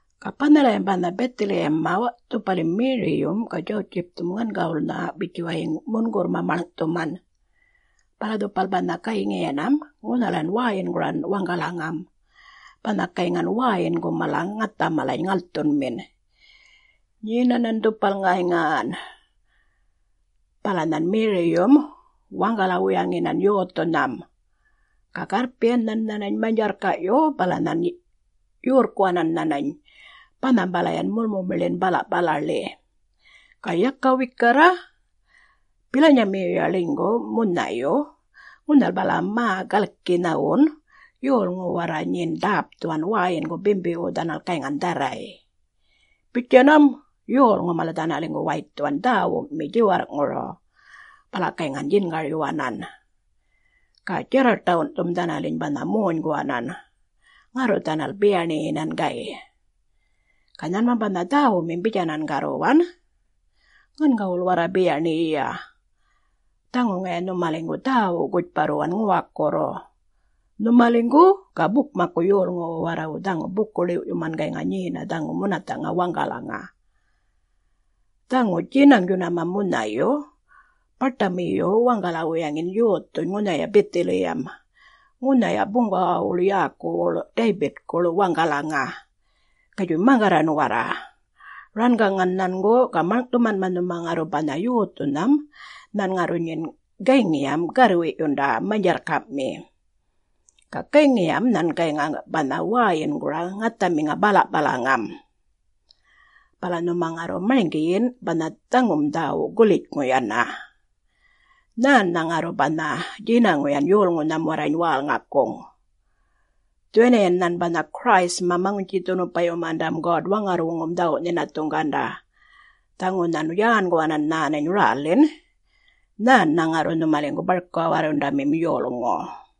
Ga banhalayam banha Bithiliyamma dhupalim Meriyum ga Djawutjipthum ŋangawulnha bitjuwayiŋ mungurrma ŋunhuŋ maḻŋ’thuman maḻŋ’thuman, bala dhupal banha gayŋiyinam ŋunhalan wäyinguran waŋgalaŋa banha gayŋan wäyingu mala ŋatha mala ŋalthunmin. Nyenanan dhupal ŋarran bala nhan Meriyum waŋgala-wuyaŋinan yothunham, ga garrpiyan nhan nhanany manydjarrka’yu, bala nhan nhanany yorrkuwanan banhambalayan mumumiḻin bala’palaḻi. Ga yaka wikarra, bilanyamiyuya ḻinygu munhayu ŋunhal bala mä galki nhawun yolŋu warra nyin ḏäpthuwan wäyingu bimbiwu dhanal gayŋan dharray. Bitjanam yolŋu mala dhanaliŋgu waythuwan dhäwumi djiwarr’ŋuru bala gayŋan djingaryuwanan. Ga djarraṯawundhum dhanaliny banha monyguwanan bala dhanal biyaṉiyinan. Ga nhanmam banha dhäwumim bitjanan garruwan gam’, “Ŋangawul Ŋangawul warra biyaṉiyiya, dhaŋu ŋaya nhumaliŋgu dhäwu gutjparruwan ŋuwakurru,….nhumaliŋgu ga bukmakku yolŋuwu warrawu dhaŋu ḏämbu-ḻiw’yuman gayŋa nyena dhaŋu munatha’ŋa waŋgalaŋa. Dhaŋu djinaŋ djunama munhayu baṯamiyu waŋgala-wuyaŋin yothuny ŋunhaya Bithiliyam, ŋunhaya buŋgawawuḻ yäkuwuḻ Daybitkuḻ waŋgalaŋa. Gatjuy maŋgarran warra rangaŋan nhangu ga maḻŋ’thumanma nhuma ŋarru banha yothunham nhan ŋarru nyin gayŋiya garrwi’yunda manydjarrka’mi. Ga gayŋiyam nhan gayŋa banha wäyingura ŋathamiŋa bala’palaŋam. Bala nhuma ŋarru marŋgiyin banha dhaŋum dhäwu gulitjŋu yana. Nhännha ŋarru banha djinaŋuyan yolŋunham warrany wälŋakuŋ. Dhuwaniyan nhan banha Christ-ma Maŋutji-dhunupayumandam God-Waŋarrwuŋum dhawu’-nhinathuŋganda, dhaŋu nhan yänguwanan nhanany rälin nhan ŋarru nhumaliŋgu barka-warrundamin yolŋu.”